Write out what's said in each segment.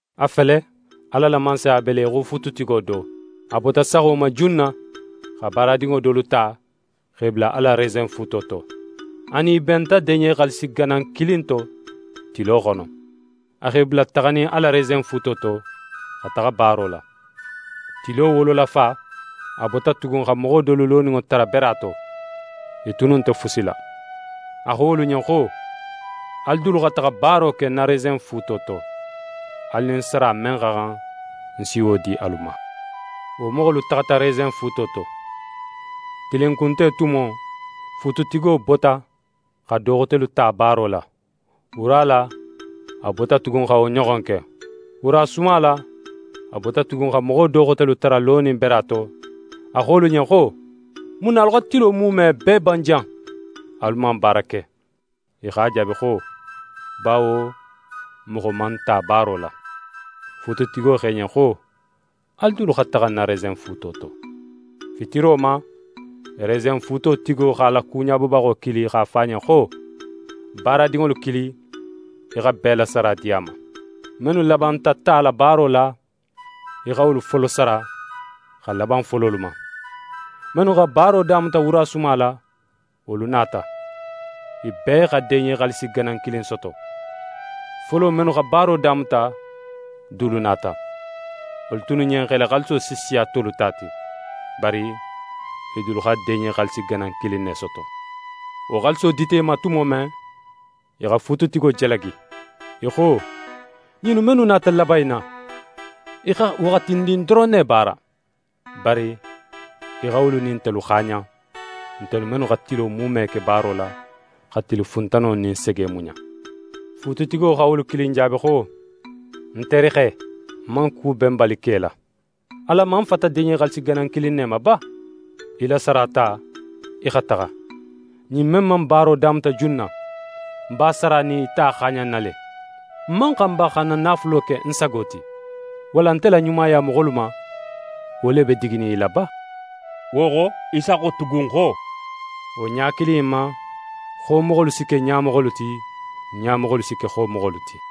«A fele, Ala la Mansaya be le í xo fuututigo do, a bota saxo ma junna xa baaradinŋo dolu ta x'e bula a la resenfuuto to. A nin i benta deɲe xaalisi ganan kilin to tilo xono. A x'e bula taxanin a la resenfuuto to, xa taxa baaro la. Tilo wololafa, a bota tugun xa moxo dolu loninŋo tara bera to, i tunnu nte fusi la. A xo wolu ɲen xo: “Alu dulu xa taxa baaro ke ń na resenfuuto to, alu nin sara men xa xan, ń si wo di alu ma.” Wo moxolu taxata resenfuuto to. Tilinkunte tumo, fuututigo bota xa do xotelu ta baaro la. Wura la, a bota tugun xa wo ɲoxon ke. Wurasuma la, a bota tugun xa moxo do xotelu tara lonin bera to, a xo wolu ɲen xo: “Mun na alu xa tilo muume bee ban jan, alu man baara ke?” I x'a jaabi xo: “Bawo moxo man n ta baaro la.” Fuututigo xo i ɲen xo: “Alu dulu xa taxa ń na resenfuuto to.” Fitiro ma, resenfuuto tigo x'a la kuɲabobaxo kili x'a fo a ɲen xo: “Baaradinŋolu kili, í xa bee la sara di a ma. Mennu labanta tala baaro la, í xa wolu folo sara, xa laban fololu ma.” Mennu xa baaro damuta wurasuma la, wolu nata. I bee xa deɲe xaalisi ganan kilin soto. Folo mennu xa baaro damuta dulu nata. Wolu tunnu ɲen x'e la xaaliso si siya tolu ta ti. Bari i dulu xa deɲe xaalisi ganan kilin ne soto. Wo xaaliso dita i ma tumo men, i xa fuututigo jalagi. I xo: “Ɲinnu mennu nata laban in na, i xa waxatindin doron ne baara. Bari í xa wolu nin ntelu xaaɲan, ntelu mennu xa tilo muume ke baaro la, xa tili funtano nin sege muɲa.” Fuututigo xa wolu kilin jaabi xo: “Ń terixe, ń man ku benbali ke í la. Alan man fata deɲe xaalisi ganan kilin ne ma ba? Í la sara ta í xa taxa. Ɲin men man baaro damuta junna, ń b'a sara nin í ta xaaɲanna le! Ń man xan ba xa ń na naafulo ke ń sago ti? Walla nte la ɲumaya moxolu ma, wo le be diginin í la ba?”» Wo xo, Isa xo tugun xo: «Wo ɲa kili in ma, xomoxolu si ke ɲamoxolu ti, ɲamoxolu si ke xomoxolu ti.»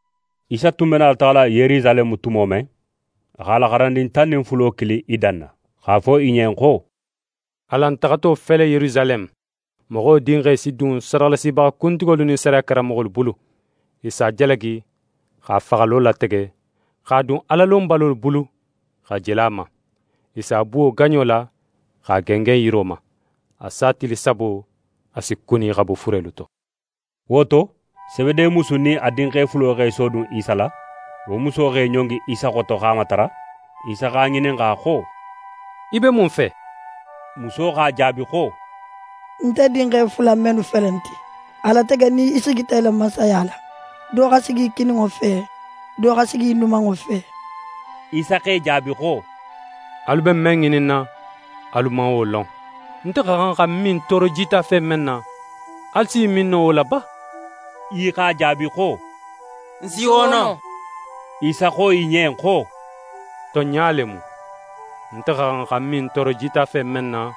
Isa tun be nala taxala Yerusaleme tumo men, a x'a la xarandin tan nin fulo kili i danna, x'a fo i ɲen xo: «Alan taxato fele Yerusaleme, Moxo Dinxe si dun sadaxalasibaxa kuntigolu nin sariya karanmoxolu bulu. I si a jalagi, x'a faxalo latege, x'a dun Alalonbalolu bulu xa jele a ma. I si a buwo gaɲo la, x'a gengen yiro ma. A sa tili sabo, a si kuni xa bo furelu to.» Wo to, Sebede musu nin a dinxe fulo x'e sodun Isa la. Wo muso x'é ɲongi Isa xoto x'a matara. Isa x'a ŋininxa xo: «Í be mun fe?» Muso x'a jaabi xo: «Nte dinxe fula innu mennu felenti, a latege nin í sigita í la Mansaya la, do xa sigi í kininŋo fe, do xa sigi í numanŋo fe.» Isa x'e jaabi xo: «Alu be men ŋininna, alu man wo lon. Nte xa xan xa ń min tooro jitafe men na, alu s'i min no wo la ba?» I x'a jaabi xo: «N si wo no». Isa xo i ɲen xo: «Tonɲa le mu, nte xa xan xa ń min tooro jitafe men na,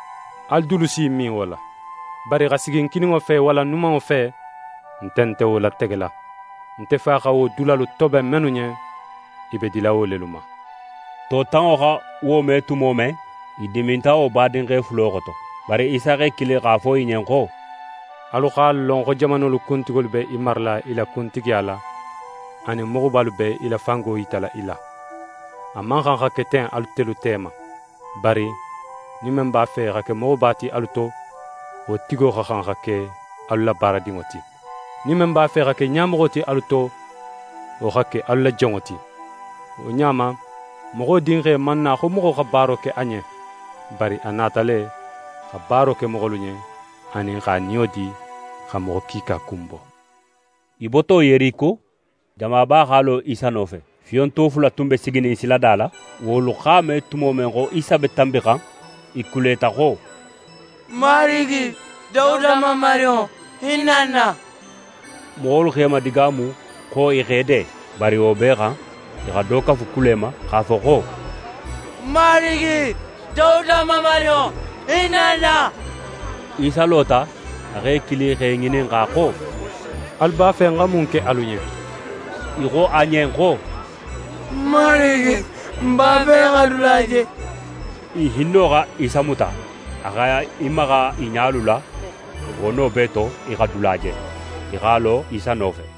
alu dulu si i min wo la. Bari xa sigi ń kininŋo fe walla ń numanŋo fe, nte nte wo lategela. Nte Fa xa wo dulalu toben mennu ɲen, i be dila wo lelu ma.» To tanŋo xa wo me tumo men, i diminta wo badinxe fulo xoto. Bari Isa x'e kili x'a fo i ɲen xo: «Alu x'a lon xo jamanolu kuntigolu be i marala i la kuntigiya la, anin moxobalu be i la fango yitala i la. A man xan xa ke ten atelu tema. Bari nin men b'a fe xa ke moxoba ti alu to, wo tigo xa xan xa ke alu la baaradinŋo ti. Nin men b'a fe xa ke ɲamoxo ti alu to, wo xa ke alu la jonŋo ti: Wo ɲa ma, Moxo Dinxe man na xo moxo xa baaro ke a ɲen; bari a nata le, xa baaro ke moxolu ɲen, anin x'a niyo di, xa moxo kiika kunbo.» I boto Yeriko, jamaba x'a lo Isa nofe. Fiyonto fula tun be siginin silada la. Wolu x'a me tumo men xo Isa be tanbixan, i kuleta xo: «Marigi, Dawuda Mamarinŋo, hinna n na!» Moxolu x'e madigaamu xo i x'e de. Bari wo bee xan, i xa do kafu kule ma, x'a fo xo: «Marigi, Dawuda Mamarinŋo, hinna n na!» Isa lota. A x'e kili x'e ŋininxa xo: «Alu b'a fe ń xa mun ke alu ɲen?» I xo a ɲen xo: «Marigi, n b'a fe xa dula je!» I hinno xa Isa muta, a x'é maxa i ɲalu la. Wo no bee to, i xa dula je, i x'a lo Isa nofe.